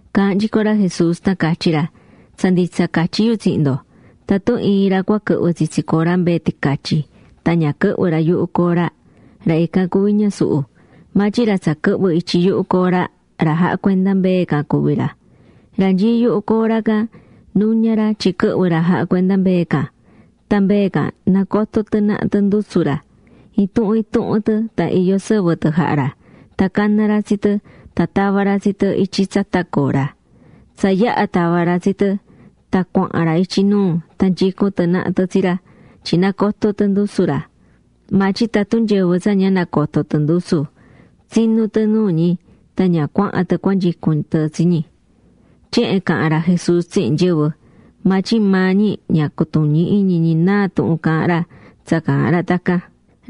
’Caahán nyico ra Jesús tan catyí ra: ―Tsa nditsa catyí yu tsihin ndo, tatun iin ra cua quɨhvɨ tsitsi cora mbee ticatyi, tan ñavin yuhu cora quɨhvɨ́ ra, ra ican cuví ñasuhu. Maa tyin ra tsa quɨhvɨ́ ityi yuhu cora, ra jahá cuenda mbee can cuví ra. Ra nyií yuhu cora can nuña ra tyin quɨhvɨ ra jahá cuenda mbee can. Tan mbee can nacotó tɨ naha tɨ ndusu ra. Intuhun intuhun tɨ tan iyó sɨvɨ tɨ jahá ra, caná ra tsi tɨ tan tavá ra tsi tɨ ityi tsata cora. Tsa yaha̱ tava̱ ra tsi tɨ, tan cuahán ra ityi nuu tan nyicún tɨ naha tɨ tsi ra, tyin nacotó tɨ ndusu ra. Maa tyin tatun nyɨvɨ tsa ña nacotó tɨ ndusu, tsinú tɨ nuu ñi tan ña cuahán tɨ cuanyicún tɨ tsi ñi. Tyehen caha̱n ra Jesús tsihin nyɨvɨ. Maa tyin maa ñi ña cutuñí iñi ñi náa tuhun caahán ra tsa caahán ra tacan.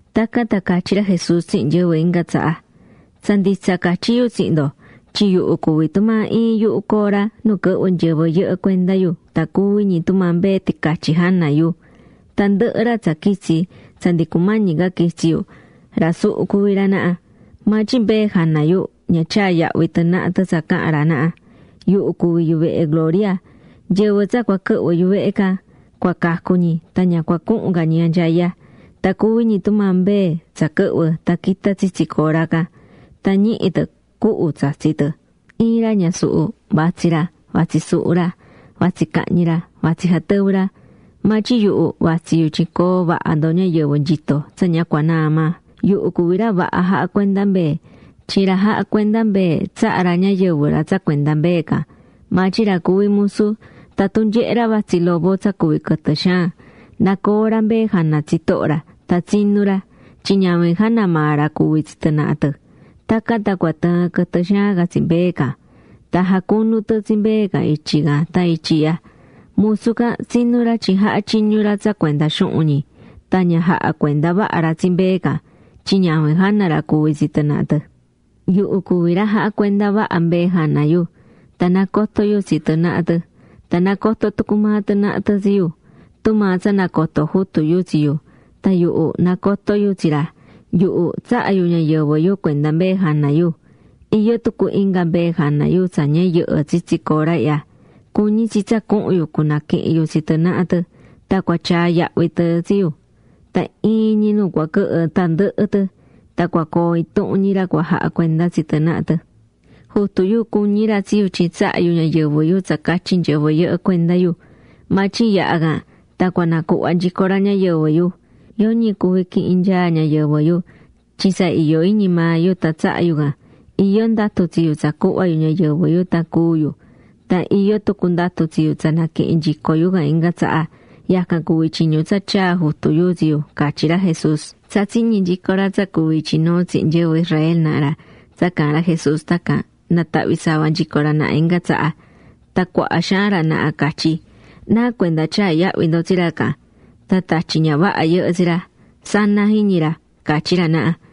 Tacan tan catyí ra Jesús tsihin nyɨvɨ inga tsaha: ―Tsa nditsa catyí yu tsihin ndo, yuhu cuví tumaa iin yuhu cora nu quɨhvɨ́ nyɨvɨ yɨhɨ cuenda yu tan cuví ñi tumaa mbee ticatyi jana yu. Tandɨhɨ ra tsa quitsi̱ tsa ndi cumañi quitsi yu, ra suhu cuví ra naha. Maa tyin mbee jana yu ña tyaa̱ yahvi tɨ naha tɨ tsa caha̱n ra naha. Yuhu cuví yuvehe gloria. Nyɨvɨ tsa cua quɨhvɨ̱ yuvehe can, cua cacu ñi tan ña cua cuhun ca ñi anyaya. Tan cuví ñi tumaa mbee tsa quɨhvɨ́ tan quitá tsitsi cora can. Tan ñihí tɨ cuhu tsatsí tɨ. ’Iin ra ñasuhu, vatsí ra, vatsí suhu ra, vatsí cahñi ra, vatsí jatɨvɨ ra. Maa tyin yuhu vatsí yu tyin coo vaha ndo ñayɨvɨ nyitó tsa ña cua naa maa. Yuhu cuví ra vaha jahá cuenda mbee. Tyin ra jahá cuenda mbee tsahá ra ñayɨvɨ ra tsa cuenda mbee can. Maa tyin ra cuví musu, tatun nyehé ra vatsí lobo tsa cuví quɨtɨ xaan, nacoó ra mbee jana tsitoho ra. Tan tsinú ra. Tyin ñavin jana maa ra cuví tsi tɨ naha tɨ. Tacan tan cua tɨɨn quɨtɨ xaan can tsi mbee can. Tan jacunu tɨ tsi mbee can ityi can tan ityi ihya. Musu can tsinú ra tyin jahá tyiñu ra tsa cuenda xuhun ñi. Tan ña jahá cuenda vaha ra tsi mbee can, tyin ñavin jana ra cuví tsi tɨ naha tɨ. ’Yuhu cuví ra jahá cuenda vaha mbee jana yu. Tan nacotó yu tsi tɨ naha tɨ. Tan nacotó tucu maa tɨ naha tɨ tsi yu, tumaa tsa nacotó Jutu yu tsi yu, tan yuhu nacotó yu tsi ra. Yuhu tsahá yu ñayɨvɨ yu cuenda mbee jana yu. Iyó tucu inga mbee jana yu tsa ña yɨhɨ́ tsitsi cora ihya. Cuñí tsi tsa cuhun yu cunaquihin yu tsi tɨ naha tɨ. Tan cua tyaa yahvi tɨ tsi yu. Tan iin ñi nu cua quɨhɨ tandɨhɨ tɨ. Tan cua coo intuhun ñi ra cua jaha cuenda tsi tɨ naha tɨ. ’Jutu yu cuñí ra tsi yu tyin tsahá yu ñayɨvɨ yu tsacatyi nyɨvɨ. Maa tyin yaha can, tan cua nacuhva nyico ra ñayɨvɨ yu. Yoñi cuvi quihin nyaá ñayɨvɨ yu, tyin tsa iyó iñi maa yu tan tsahá yu can. Iyó ndatu tsi yu tsa cuhva yu ñayɨvɨ yu tan cúu yu, tan iyó tucu ndatu tsi yu tsa naquihin nyico yu can inga tsaha. Yacan cuví tyiñu tsa tyaa̱ Jutu yu tsi yu ―catyí ra Jesús. Tsa tsiñi̱ nyico ra tsa cuví ityi nuu tsihin nyɨvɨ Israel naha ra tsa caahán ra Jesús tacan, natahvi̱ sava nyico ra naha inga tsaha. Tan cuaha xaan ra naha catyí: ―¿Nacuenda tyaá yahvi ndo tsi ra can? Tan tatyi ña vaha yɨhɨ́ tsi ra, sana jiñi ra ―catyí ra naha.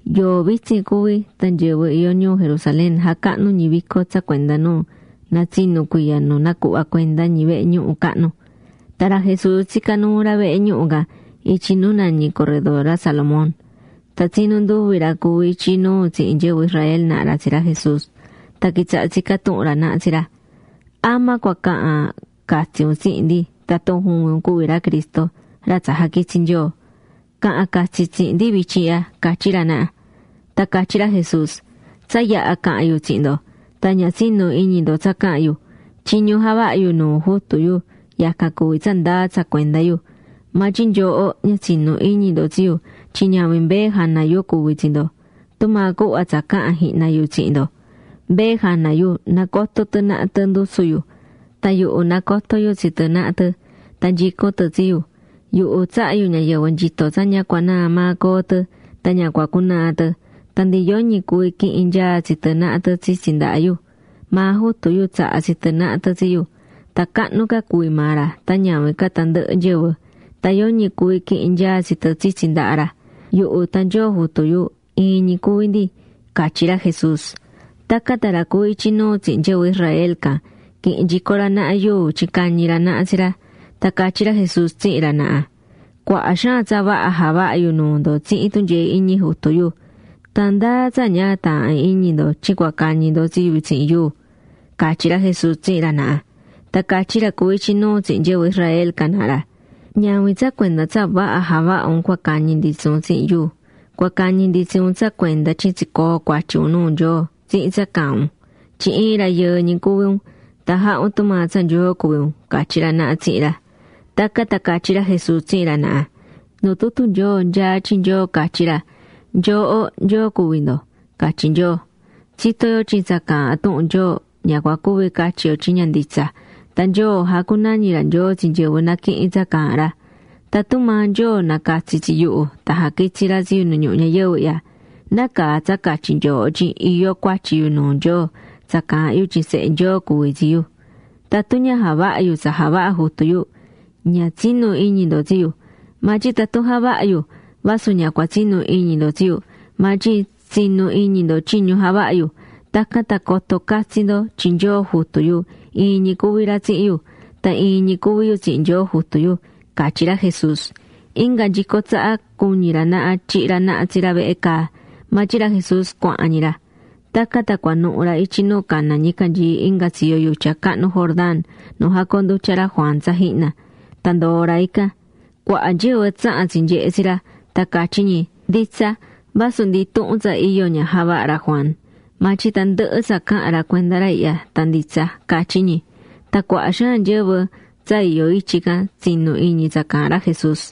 Yoo vitsin cuví tan nyɨvɨ iyó ñuu Jerusalén jacahnú ñi vico tsa cuenda nu natsinú cuiya nu nacuhva̱ cuenda ñi vehe ñuhu cahnu. Tan ra Jesús tsicá nuu ra vehe ñuhu can ityi nu nañi corredor ra Salomón. Tan tsinu nduvi ra cuví ityi nuu tsihin nyɨvɨ Israel naha ra tsi ra Jesús. Tan quitsaha̱ tsicá tuhun ra naha tsi ra: ―¿Ama cua cahan catsi un tsihin ndi tatun juvin un cuví ra Cristo ra tsa jaquitsi̱ Nyoo? Ca̱han catsi tsihin ndi vityin ihya ―catyí ra naha. Tan catyí ra Jesús: ―Tsa yaha̱ caha̱n yu tsihin ndo, tan ña tsinu̱ iñi ndo tsa caha̱n yu. Tyiñu javahá yu nuu Jutu yu yacan cuví tsa ndaa tsa cuenda yu. Maa tyin nyooho ña tsinú iñi ndo tsi yu tyin ñavin mbee jana yu cuví tsi ndo. Tumaa cuhva tsa caha̱n jihna yu tsihin ndo. Mbee jana yu nacotó tɨ naha tɨ ndusu yu, tan yuhu nacotó yu tsi tɨ naha tɨ. Tan nyicún tɨ tsi yu. Yuhu tsahá yu ñayɨvɨ nyito tsa ña cua naa maa coo tɨ. Tan ña cua cunaa tɨ. Tan ndi yoñi cuví quihin nyaa tsi tɨ naha tɨ tsitsi ndaha yu. Maa Jutu yu tsaha̱ tsi tɨ naha tɨ tsi yu. Tan cahnu ca cuví maa ra tan ñavin ca tandɨhɨ nyɨvɨ. Tan yoñi cuví quihin nyaa tsi tɨ tsitsi ndaha ra. Yuhu tan Nyoo Jutu yu, iin ñi cuví ndi ―catyí ra Jesús. Tacan tan ra cuví ityi nuu tsihin nyɨvɨ Israel can quihi̱n nyico ra naha yuu tyin cañi ra naha tsi ra. Tan catyí ra Jesús tsihin ra naha: ―Cuaha xaan tsa vaha javaha̱ yu nuu ndo tsihin tunyee iñi Jutu yu. ¿Tan ndáa tsa ña taahán iñi ndo tyin cua cañi ndo tsi yu tsihin yuu? ―catyí ra Jesús tsihin ra naha. Tan catyí ra cuví ityi nuu tsihin nyɨvɨ Israel can naha ra: ―Ñavin tsa cuenda tsa vaha javaha̱ un cua cañi ndi tsi un tsihin yuu, cua cañi ndi tsi un tsa cuenda tyin tsicoo̱ cuatyi un nuu Nyoo tsihin tsa caahán un. Tyin iin rayɨɨ ñi cuví un, tan jahá un tumaa tsa Nyoo cuví un ―catyí ra naha tsihin ra. Tacan tan catyí ra Jesús tsihin ra naha: ―Nu tutu Nyoo nyaá tyin Nyoo catyí ra: “Nyooho nyoo cuví ndo”, catyí Nyoo. Tsitó yo tyin tsa caahán tuhun Nyoo, ña cua cuvi catyi yo tyin ña nditsa. Tan Nyoo jacunañí ra nyoo tsi nyɨvɨ naquihín tsa caahán ra. Tatun maa Nyoo nacatsi̱ tsi yuhu tan jaquitsi̱ ra tsi yu nu ñuhu ñayɨvɨ ihya ¿nácaa tsa catyí nyooho tyin iyó cuatyi yu nuu Nyoo tsa caahán yu tyin Sehe Nyoo cuví tsi yu? Tatun ña javahá yu tsa javahá Jutu yu, ña tsi̱nu iñi ndo tsi yu. Maa tyin tatun javahá yu, vasu ña cua tsinu iñi ndo tsi yu, maa tyin tsi̱nu iñi ndo tyiñu javahá yu. Tacan tan coto catsi ndo tyin Nyoo Jutu yu iin ñi cuví ra tsihin yu. Tan iin ñi cuví yu tsihin Nyoo Jutu yu ―catyí ra Jesús. Inga nyico tsaha cuñi̱ ra naha tyihi ra naha tsi ra vehe caa, maa tyin ra Jesús cuahán ñi ra. Tacan tan cuanuhu̱ ra ityi nu caná ñicanyii inga tsiyo yutya cahnu Jordán nu jacoondutya̱ ra Juan tsa jihna, tan ndoo̱ ra ican. Cuaha nyɨvɨ tsaha̱n tsinyehe̱ tsi ra, tan catyí ñi: ―Nditsa, vasu ndi intuhun tsa iyo ña javaha̱ ra Juan, maa tyin tandɨhɨ tsa caha̱n ra cuenda ra ihya tan nditsa ―catyí ñi. Tan cuaha xaan nyɨvɨ tsa iyó ityi can tsinu̱ iñi tsa caahán ra Jesús.